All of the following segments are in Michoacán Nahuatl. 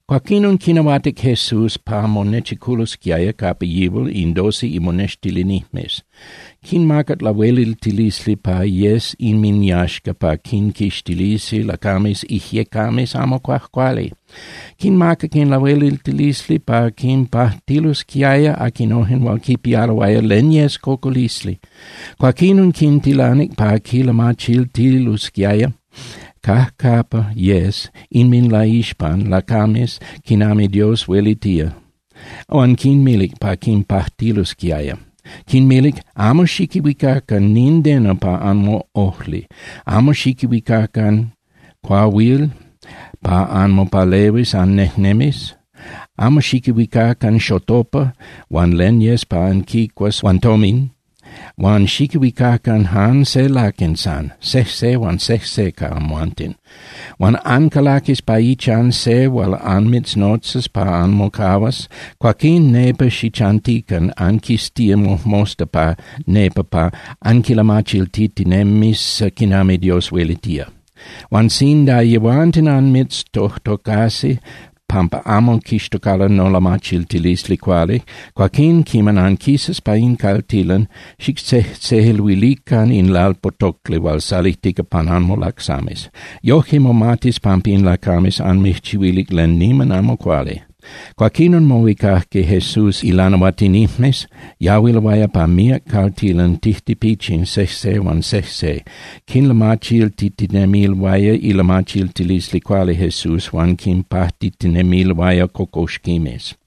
Cuaquinon quinahuatic Jesús pa monechiculosquiaya capa yihual in doce imonextilinijmes. Quinmacac lahueliltilisli pa yes inminyaxca pa quinquixtilisi lacames ijyecames amo cuajcuali. Quinmacac in lahueliltilisli pa quinpajtilosquiaya aquinojen hual quipialoaya len yes cocolisli. Cuaquinon quintilanic pa quilamachiltilosquiaya cajcapa yes inminlaixpan lacames quinami Dios huelitía, huan quinmilic pa quinpajtilosquiaya. Quinmilic: —Amo xiquihuicacan nindeno pa anmoꞌojli, amo xiquihuicacan cuahuil pa anmopalehuis annejnemis, amo xiquihuicacan xotopa huan len pa anquicuas huan tomin. Huan xiquihuicacan jan se laquen san, sejse huan sejse ca amhuanten. Huan ancalaquis pa ichan se hual anmitznotzas pa anmocahuas, cuaquín nepa xichantican anquistía mojmosta pa nepa pa anquilamachiltitinemis quinami Dios huelitía. Huan sinda yehuanten anmiztojtocasi pampa amo quixtocalo nolamachiltilisli cuali, cuaquín quiman anquisas pa in caltilan, xictzejtzeluilican in lalpotocli hual salijtica pan anmolacsames. Yoje momatis pampa in lacames anmijchihuilic len niman amo cuali. Cuaquinon mohuicajque Jesús ilanahuatinijmes, yahuiloaya pa míac caltilan tijtipichin sejse huan sejse, quinlamachiltitinemiloaya ilamachiltilisli cuali Jesús huan quinpajtitinemiloaya cocoxquimes.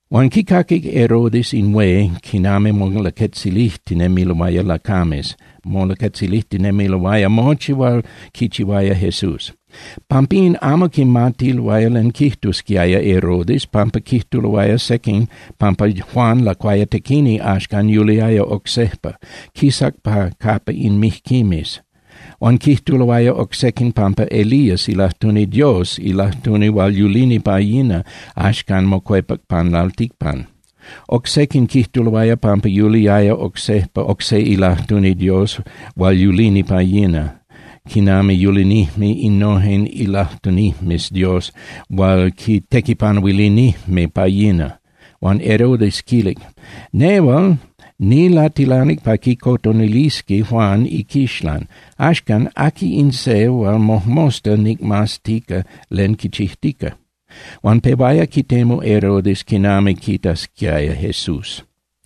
Huan quicaquic Herodes in hué quinami molaquetzilijtinemiloaya lacames, molaquetzilijtinemiloaya mochi hual quichihuaya Jesús. Pampín amo quimatiaya len quijtusquiaya Herodes pampa quijtuloaya sequin pampa Juan Lacuayatequini axcan yuliaya oc sejpa, quisac pa capa in mijquimes. Huan quijtuloaya oc sequin pampa Elías ilajtuni Dios, ilajtuni hual yulini pa yina, axcan mocuepac pan lalticpan. Oc sequin quijtuloaya pampa yuliaya oc sejpa oc se ilajtuni Dios hual yulini pa yina quinami yulinijme innojen ilajtunijmes Dios hual quitequipanuilinijme pa yina. Huan Herodes quilic: —Nehual nilatilanic pa quicotonilisqui Juan iquixlan. Axcan, ¿aqui in se hual mojmosta nicmaztica len quichijtica? Huan pehuaya quitemu Herodes quinami quitasquiaya Jesús.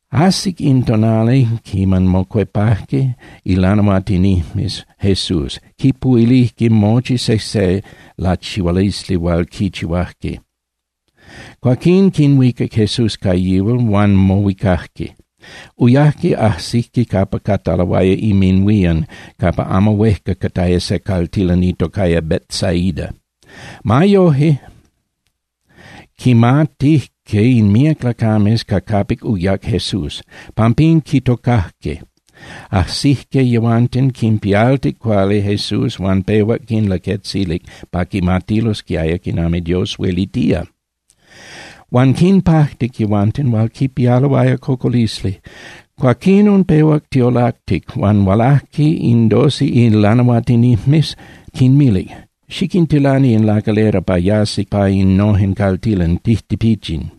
Ajsic in tonali quiman mocuepajque ilanahuatinijmes Jesús, quipuhuilijque mochi sejse lachihualisli hual quichihuajque. Cuaquín quinhuicac Jesús ca yihual, huan mohuicajque. Uyajque ajsijque capa cataloaya inminhuían capa amo huejca cataya se caltilan itocaya Betsaida. Ma yoje, quimatijque in míac lacames ca capic uyac Jesús, pampín quitocajque. Ajsijque yehuanten, quinpialtic cuali Jesús huan pehuac quinlaquetzilic pa quimatilosquiaya quinami Dios huelitía. Huan quinpajtic yehuanten hual quipialoaya cocolisli. Cuaquinon pehuac tiolactic, huan hualajque in doce ilanahuatinijmes, quinmilic: —Xiquintilani in lacalera pa yasi pa innojen caltilan tijtipichin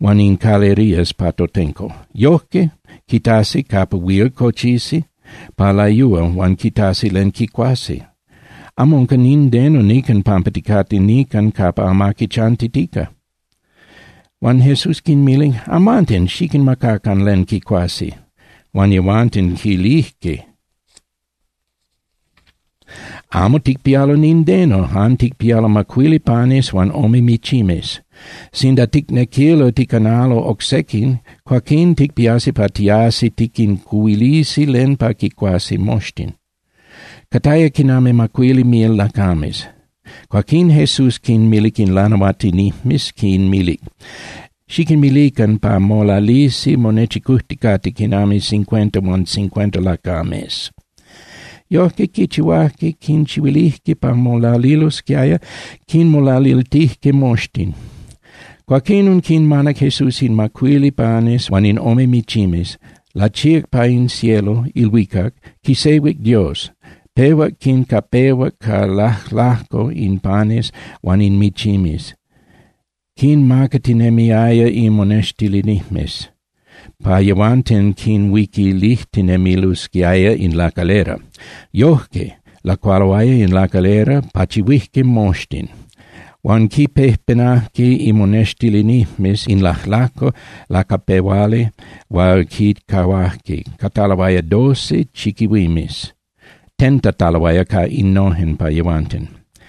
huan in calerías pa totenco. Yojque quitasi capa huil cochisi pa layúa huan quitasi len quicuasi. Amo unca nindeno nican pampa ticate nican capa amaqui chantitica. Huan Jesús quinmilic: —Amhuanten xiquinmacacan len quicuasi. Huan yehuanten quilijque: —Amo ticpialo nindeno, jan ticpialo macuili panes huan ome michimes. Sinda ticnequilo ticanalo oc sequin, cuaquín ticpiasi pa tiasi tiquincuhuilisi len pa quicuasi moxtin. Cataya quinami macuili mil lacames. Cuaquín Jesús quinmilic ilanahuatinijmes, quinmilic: —Xiquinmilican pa molalisi monechicujticate quinami cincuenta huan cincuenta lacames. Yojque quichihuajque, quinchihuilijque pa molalilosquiaya, quinmolaliltijque moxtin. Cuaquinon quinmanac Jesús in macuili panes huan in ome michimes, lachíac pa in cielo (ilhuicac), quisehuic Dios, pehuac quincapehuac ca lajlajco in panes huan in michimes, quinmacatinemiaya imonextilinijmes pa yehuanten quinhuiquilijtinemilosquiaya in lacalera. Yojque lacualoaya in lacalera, pachihuijque moxtin. Huan quinpejpenajque imonextilinijmes in lajlajco lacapehuali hual quincahuajque, cataloaya doce chiquihuimes tentataloaya ca innojen pa yehuanten.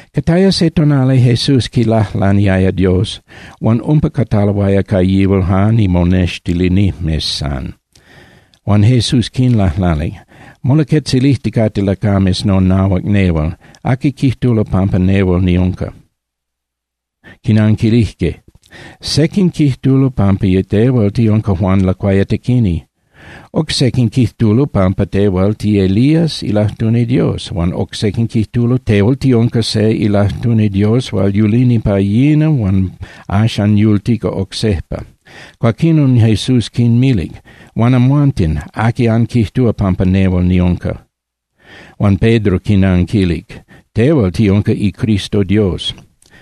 Cataya se tonali Jesús quilajlaniaya Dios, huan umpa cataloaya ca yihual jan imonextilinijmes san. Huan Jesús quinlajlanic: —Molaquetzilijticate lacames nonahuac nehual, ¿aqui quijtulo pampa nehual niunca? Quinanquilijque: —Sequin quijtulo pampa tehual tiunca Juan Lacuayatequini. Oc sequin quijtulo pampa tehual tiElías ilajtuni Dios. Huan oc sequin quijtulo tehual tiunca se ilajtuni Dios hual yulini pa yina huan axan yultica oc sejpa. Cuaquinon Jesús quinmilic: —Huan amhuanten, ¿aqui anquijtúa pampa nehual niunca? Huan Pedro quinanquilic: —Tehual tiunca iCristo Dios.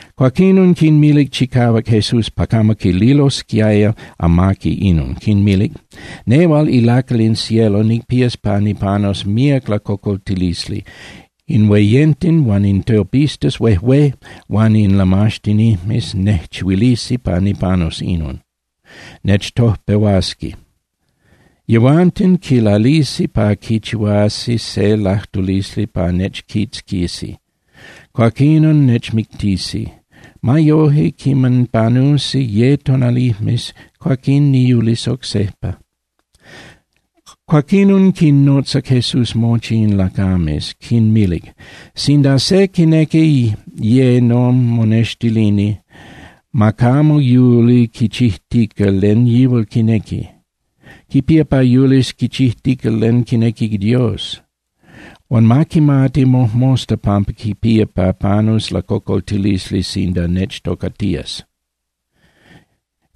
Cuaquinon quinmilic chicahuac Jesús pa camo quililosquiaya amaqui inon, quinmilic: —Nehual ilacal in cielo nicpías pa nipanus míac lacocoltilisli. In hueyenten huan in tiopistas huejué huan in lamaxtinijmes nejchihuilisi pa nipanus inon, nechtojpehuasqui. Yehuanten quilalisi pa quichihuasi se lajtulisli pa nechquitzquisi, cuaquinon nechmictisi. Ma yoje, quiman panusi ye tonalijmes, cuaquín niyulis oc sejpa. Cuaquinon quinnotzac Jesús mochi in lacames, quinmilic: —Sinda se quinequi ye nomonextilini, ma camo yuli quichijtica len yihual quinequi. Quipía pa yulis quichijtica len quinequi Dios. Huan ma quimati mojmosta pampa quipía pa panus lacocoltilisli sinda nechtocatías,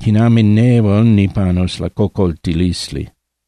quinami nehual nipanus lacocoltilisli.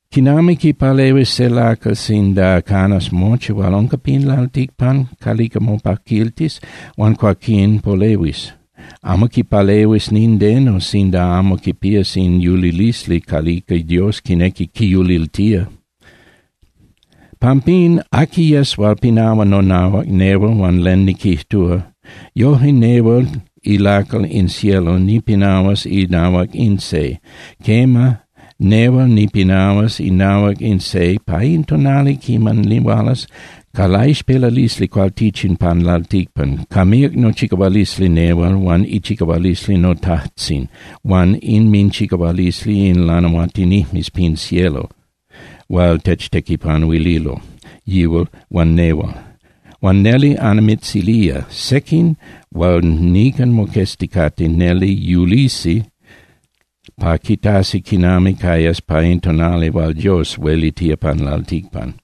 ¿Quinami quipalehuis se lacal sinda canas mochi hual unca pin lalticpan calica mopaquiltis huan cuaquín polehuis? Amo quipalehuis nindeno sinda amo quipías in yulilisli calica Dios quinequi quiyuliltía. Pampín, aqui yes hual pinahua nonahuac nehual huan len niquijtúa, yoje nehual ilacal in cielo nipinahuas inahuac in se. Quema, nehual nipinahuas inahuac in se pa in tonali quiman nihualas ca laixpelalisli cualtichin pan lalticpan ca míac nochicahualisli nehual huan ichicahualisli noTajtzin huan inminchicahualisli in lanahuatinijmes pin cielo hual techtequipanuililo yihual huan nehual. Huan neli annimitzilía. Sequin hual nican moquezticate neli yulisi pa quitasi quinami cayas pa in tonali hual Dios huelitía pan lalticpan.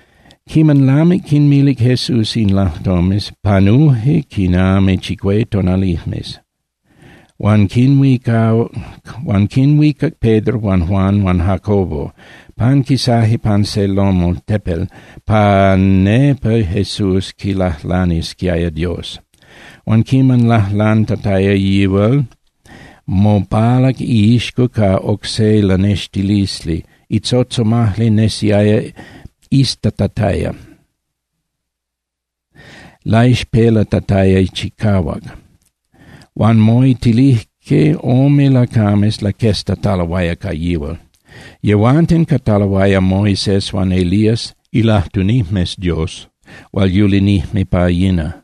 Quiman lamic quinmilic Jesús in lajtomes, panuje quinami chicué tonalijmes, huan quinhuicac Pedro huan Juan huan Jacobo, panquisaje pan se loma (tepel) pa nepa Jesús quilajlanisquiaya Dios. Huan quiman lajlantataya yihual, mopalac iixco ca oc se lanextilisli. Itzotzomajli nesiaya iztatataya, laixpelatataya chicahuac. Huan moitilijque ome lacames laqueztataloaya ca yihual. Yehuanten cataloaya Moisés huan Elías ilajtunijmes Dios hual yulinijme pa yina.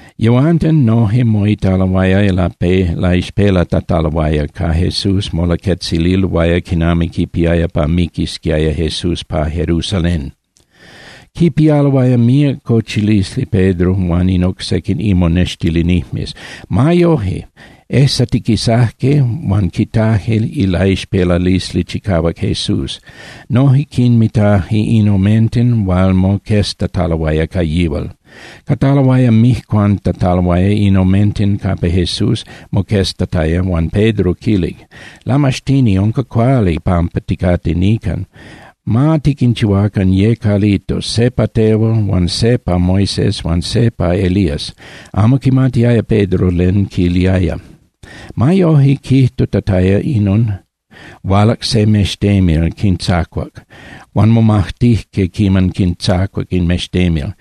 Yehuanten noje moitaloaya laixpelatataloaya, ca Jesús molaquetzililoaya quinami quipiaya pa miquisquiaya Jesús pa Jerusalén. Quipialoaya míac cochilisli Pedro huan in oc sequin imonextilinijmes. Ma yoje, ejsatiquisajque huan quitajque ilaixpelalisli chicahuac Jesús. Noje quinmitaje in omenten hual moqueztataloaya ca yihual. Cataloaya mijcuantataloaya in omenten capa Jesús moqueztataya, huan Pedro quilic: —Lamaxtini, unca cuali pampa ticate nican. Ma tiquinchihuacan ye calitos, se pa tehual huan se pa Moisés huan se pa Elías. Amo quimatiaya Pedro len quiliaya. Ma yoje, quijtutataya inon, hualac se mextemil, quintzacuac. Huan momajtijque quiman quintzacuac in mextemil.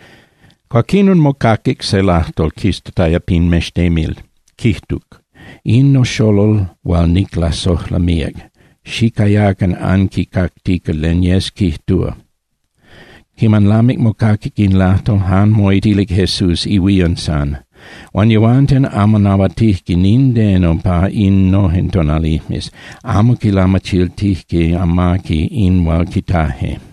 Cuaquinon mocaquic se lajtol quistataya pin mextemil, quijtuc: —In noxolol hual niclasojla míac. Xicayacan anquicactica len yes quijtúa. Quiman lamic mocaquic in lajtol, jan moitilic Jesús ihuían san. Huan yehuanten amo nahuatijque nindeno pa innojen tonalijmes, amo quilamachiltijque amaqui in hual quitaje.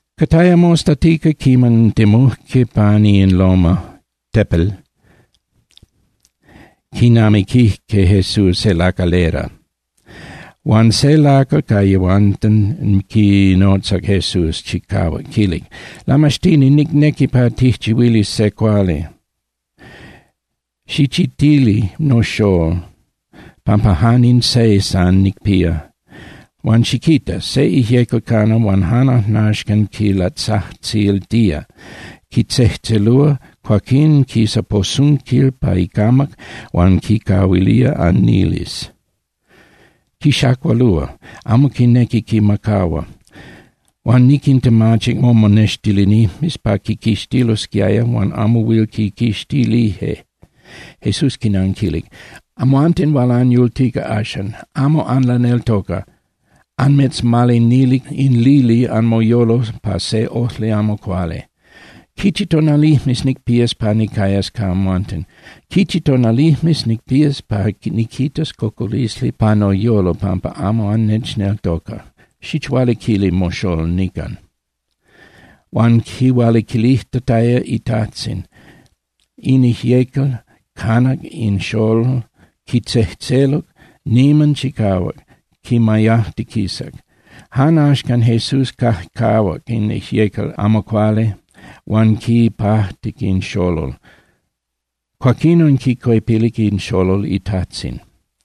Cataya mostatica quiman temujque pani in loma (tepel), quinamiquijque Jesús se lacalera. Huan se lacal ca yehuanten quinotzac Jesús chicahuac, quilic: —Lamaxtini, nicnequi pa tijchihuilis se cuali. Xichitili noxól, pampa jan in se san nicpía. Huan ¡xiquita! Se ijyecal cana huan jan ajnaxcan quilatzajtziltía, quitzejtzelúa, cuaquín quisa posunquil pa icamac huan quicahuilía aniles, quixacualúa, amo quinequi quimacahua. Huan niquintemachic momonextilinijmes pa quiquixtililosquiaya, huan amo huil quiquixtilije. Jesús quinanquilic: —¡Amhuanten hual anyultica axan! ¡Amo anlaneltoca, anmitzmalinilic in lili anmoyolo pa se ojli amo cuali! ¿Quichi tonalijmes nicpías pa nicayas ca amhuanten? ¿Quichi tonalijmes nicpías pa niquitas cocolisli pa noyolo pampa amo annechneltoca? Xichualiquili moxól nican. Huan quihualiquilijtataya itajtzin, in ijyecal canac in xolol, quitzejtzeluc niman chicahuac, quimayajtiquisac. Jan axcan Jesús cajcajuac in ijyecal amo cuali huan quipajtic in xolol, cuaquinon quicuepilic in xolol itajtzin.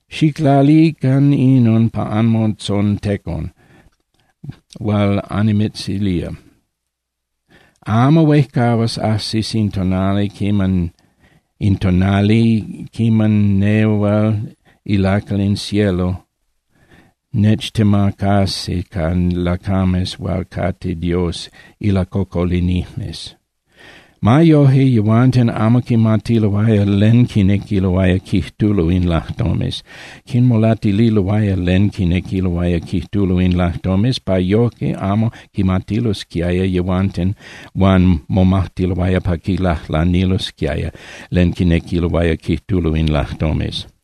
—Xiclalican inon pa anmotzontecon hual annimitzilía: Amo huejcahuas ajsis in tonali quiman nehual ilacal in cielo nechtemacasi ca lacames hual cate Dios ilacocolinijmes. Ma yoje, yehuanten amo quimatiloaya len quinequiloaya quijtulo in lajtomes, quinmolatililoaya len quinequiloaya quijtulo in lajtomes pa yoje amo quimatilosquiaya yehuanten. Huan momajtiloaya pa quilajlanilosquiaya len quinequiloaya quijtulo in lajtomes.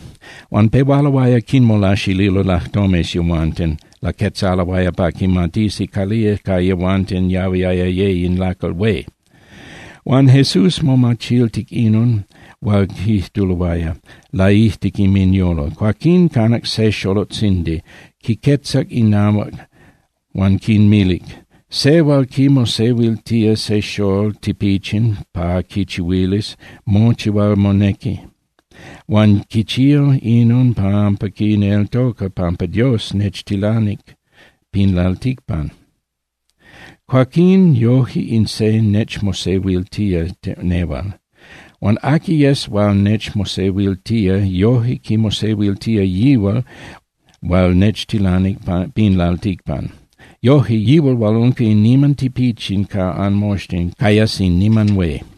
Huan pehualoaya quinmolaxililo lajtomes yehuanten, laquetzaloaya pa quimatisi calía ca yehuanten yahuiaya ye in lacal hué. Huan Jesús momachiltic inon hual quijtuloaya laijtic inminyolo. Cuaquinon canac se xolotzindi, quiquetzac inahuac huan quinmilic: —Se hual quimosehuiltía se xól tipichin pa quichihuilis mochi hual monequi, huan quichía inon pampa quineltoca pampa Dios nechtilanic pin lalticpan, cuaquín yoje in se nechmosehuiltía nehual. Huan aqui yes hual nechmosehuiltía, yoje quimosehuiltía yihual hual nechtilanic pin lalticpan. Yoje, yihual hual unca in niman tipichin ca anmoxtin cayas in niman hué.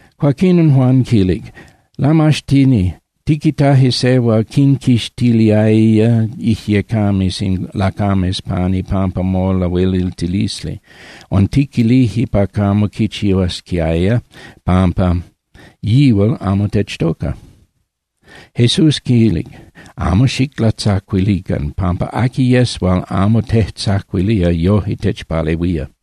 Cuaquinon Juan quilic: —Lamaxtini, tiquitaje se hual quinquixtiliaya ijyecames in lacames pan ipampa molahueliltilisli. Huan tiquilije pa camo quichihuasquiaya pampa yihual amo techtoca. Jesús quilic: —Amo xiclatzacuilican, pampa aqui yes hual amo tejtzacuilía yoje techpalehuía.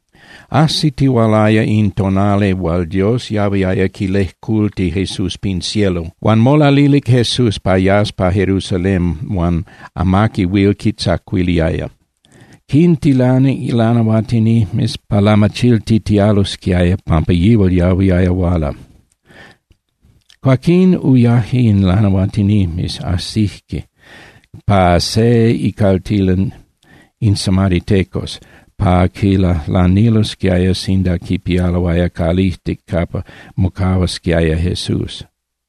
Ajsitihualaya in tonali hual Dios yahuiaya quilejculti Jesús pin cielo, huan molalilic Jesús pa yas pa Jerusalén huan amaqui huil quitzacuiliaya. Quintilanic lanahuatinijmes pa lamachiltitialosquiaya pampa yihual yahuiaya huala. Cuaquín uyaje in lanahuatinijmes, ajsijque pa se icaltilan in samaritecos pa quilajlanilosquiaya sinda quipialoaya calijtic capa mocahuasquiaya Jesús.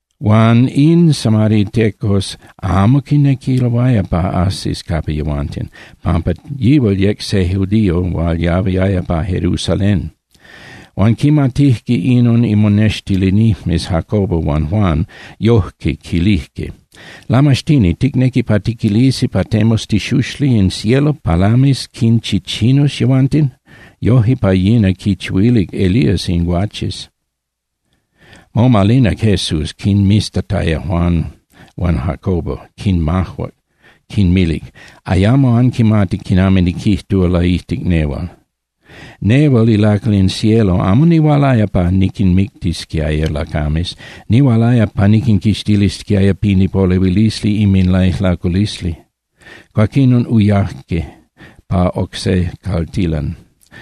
Huan in samaritecos amo quinequiloaya pa ajsis capa yehuanten, pampa yihual yec se judío hual yahuiaya pa Jerusalén. Huan quimatijque inon imonextilinijmes Jacobo huan Juan, yoje quilijque: —Lamaxtini, ¿ticnequi pa tiquilisi pa temus itixuxli in cielo pa lamis quinchichinus yehuanten? Yoje pa yina quinchihuilic Elías in guaches. Momalinac Jesús, quinmiztataya Juan huan Jacobo, quinmajuac, quinmilic: —Ayamo anquimati quinami niquijtúa laijtic nehual. Nehual ilacal in cielo amo nihualaya pa niquinmictisquiaya lacames. Nihualaya pa niquinquixtilisquiaya pin ipolehuilisli inminlaijlaculisli. Cuaquinon uyaje pa oc se caltilan.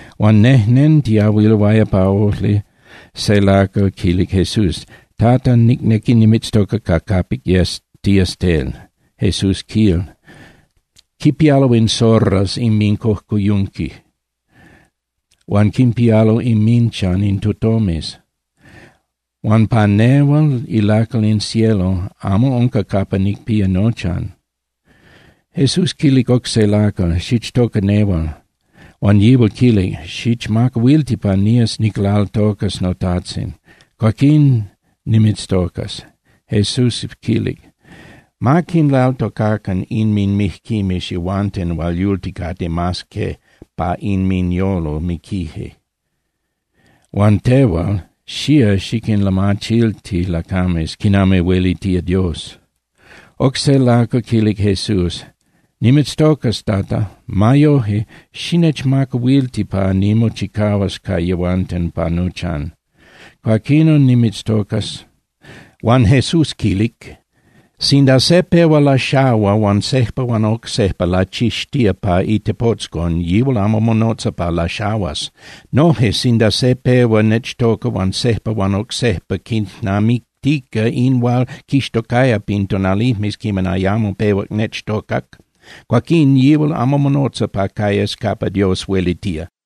Huan nejnentiyahuiloaya pa ojli, se lacal quilic Jesús: —Tata, nicnequi nimitztoca ca capic yes tías tel. Jesús quilic: —Quipialo in zorras inmincojcoyunqui, huan quinpialo inminchan in tutomes. Huan pa nehual ilacal in cielo amo unca capa nicpía nochan. Jesús quilic oc se lacal: —Xichtoca nehual. Huan yihual quilic: —Xichmacahuilti pa nías niclaltocas notajtzin. Cuaquín nimitztocas. Jesús quilic: —Ma quinlaltocacan inminmijquimes yehuanten hual yulticate mas que pa inminyolo miquije. Huan tehual, xía xiquinlamachilti lacames quinami huelitía Dios. Oc se lacal quilic Jesús: —Nimitztocas, Tata. Ma yoje, xinechmacahuilti pa nimochicahuas ca yehuanten pa nochan. Cuaquinon nimitztocas. Huan Jesús quilic: —Sinda se pehua laxahua huan sejpa huan oc sejpa lachixtía pa itepotzcon, yihual amo monotza pa laxahuas. Noje, sinda se pehua nechtoca huan sejpa huan oc sejpa quijnamictica in hual quixtocaya pin tonalijmes quiman ayamo pehuac nechtocac, cuaquín yihual amo monotza pa cayas capa Dios huelitía.